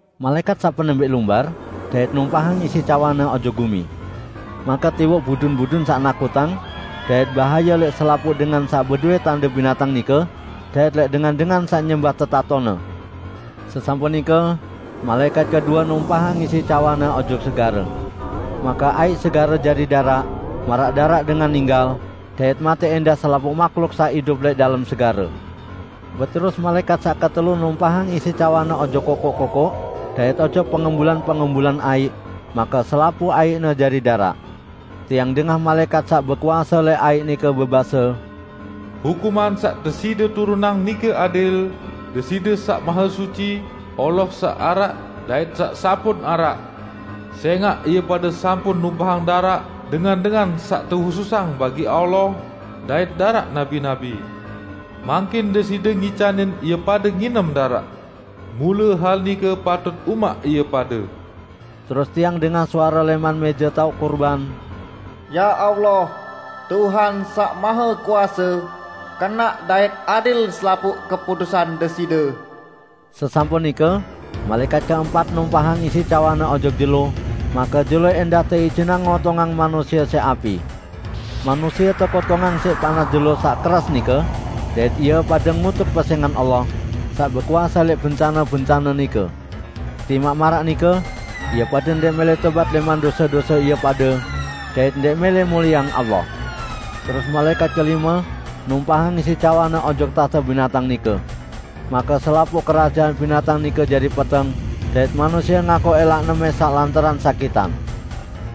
Malaẽkat saq penembẽq lumbar, dait numpahang isi cawanne ojok gumi. Make tiwoq budun-budun saq nakutang dait bahaye lẽq selapuq dengan saq bedowẽ tande binatang nike, dait lẽq dengan-dengan saq nyembah tetatone. Sesampun nike malaẽkat kedue numpahang isi cawanne ojok segare. Make aiq segare jari daraq, maraq daraq dengan ninggal, dait matẽ ẽndah selapuq mahluk saq idup lẽq dalem segare. Beterus malaẽkat saq ketelu numpahang isi cawanne ojok kokoq-kokoq dait ojok pengembulan-pengembulan aiq, make selapuq aiqne jari daraq. Tiang dengah malaẽkat saq bekuase lẽq aiq nike bebase, "Hukuman saq Deside turunang nike adil, Deside saq Mahesuci, Allah saq araq, dait saq sampun araq! Sẽngaq ie pade sampun numpahang daraq dengan-dengan saq tehususang bagi Allah dait daraq nabi-nabi; mangkin Deside ngicanin ie pade nginem daraq. Mule hal nike patut umaq ie pade!" Terus tiang dengah suare lẽman mẽje taoq kurban, "Ya Allah, Tuhan Saq Mahekuase, kenaq dait adil selapuq keputusan Deside!" Sesampun nike malaẽkat keempat numpahang isi cawanne ojok jelo, make jelo ẽndah teijinang ngotongang manusie siq api. Manusie tekotongang siq panas jelo saq keras nike, dait ie pade ngutuk pesẽngan Allah, saq bekuase lẽq bencane-bencane nike. Timaq maraq nike, ie pade ndẽq mẽlẽ tobat lẽman dose-dose ie pade dait ndẽq mẽlẽ mulieang Allah. Terus malaẽkat kelime numpahang isi cawanne ojok tahte binatang nike. Make selapuq kerajaan binatang nike jari peteng, dait manusie ngakoq ẽlaqne mẽsaq lantaran sakitan.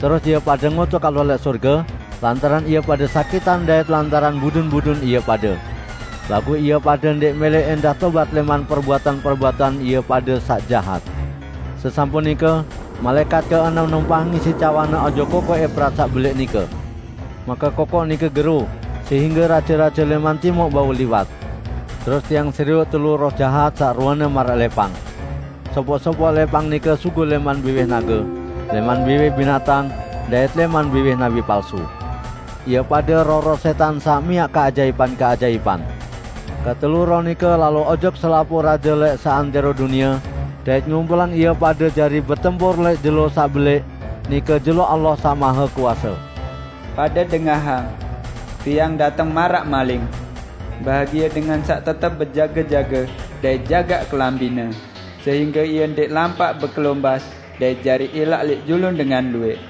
Terus ie pade ngutuk Allah lẽq sorge lantaran ie pade sakitan dait lantaran budun-budun ie pade. Laguq ie pade ndẽq mẽlẽ ẽndah tobat lẽman perbuatan-perbuatan ie pade saq jahat. Sesampun nike malaẽkat keenem numpahang isi cawanne ojok kokoq Eprat saq belẽq nike. Make kokoq nike gero sehingge raje-raje lẽman timuq bau liwat. Terus tiang serioq telu roh jahat saq ruene maraq lẽpang. Sopoq-sopoq lẽpang nike sugul lẽman biwih nage, lẽman biwih binatang, dait lẽman biwih nabi palsu. Ie pade roh-roh sẽtan saq miaq keajaipan-keajaipan. Ketelu roh nike lalo ojok selapuq raje lẽq seantẽro dunie dait ngumpulang ie pade jari betempur lẽq jelo saq belẽq, nike jelo Allah Saq Mahekuase. "Pade dengahang! Tiang dateng maraq maling! Bahagie dengan saq tetep bejage-jage dait jagaq kelambine, sehingge ie ndẽq lampaq bekelombas dait jari ilaq lẽq julun dengan luwẽq!"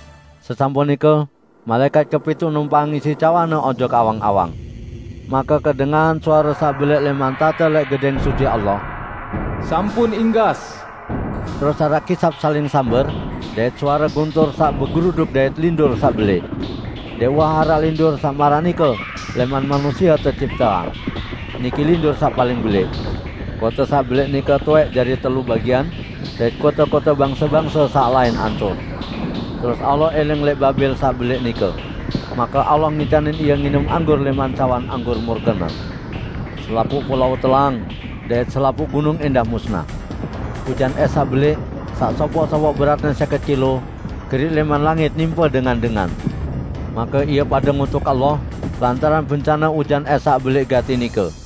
Sesampun nike malaẽkat kepituq numpahang isi cawanne ojok awang-awang. Make kedengahan suare saq belẽq lẽman tahte lẽq Gedẽng Suci Allah, "Sampun inggas!" Terus araq kisap saling samber dait suare guntur saq begeruduk dait lindur saq belẽq. Ndẽq uwah araq lindur saq maraq nike lẽman manusie tecipteang. Niki lindur saq paling belẽq! Kote saq belẽq nike towẽq jari telu bagian, dait kote-kote bangse-bangse saq lain ancur. Terus Allah iling lẽq Babel saq belẽq nike. Make Allah ngicanin ie nginem anggur lẽman cawan anggur murke-Ne. Selapuq pulao telang, dait selapuq gunung ẽndah musnah. Ujan ẽs saq belẽq, saq sopoq-sopoq beratne sẽket kilo, geriq lẽman langit nimpe dengan-dengan. Make ie pade ngutuk Allah lantaran bencane ujan ẽs saq belẽq gati nike.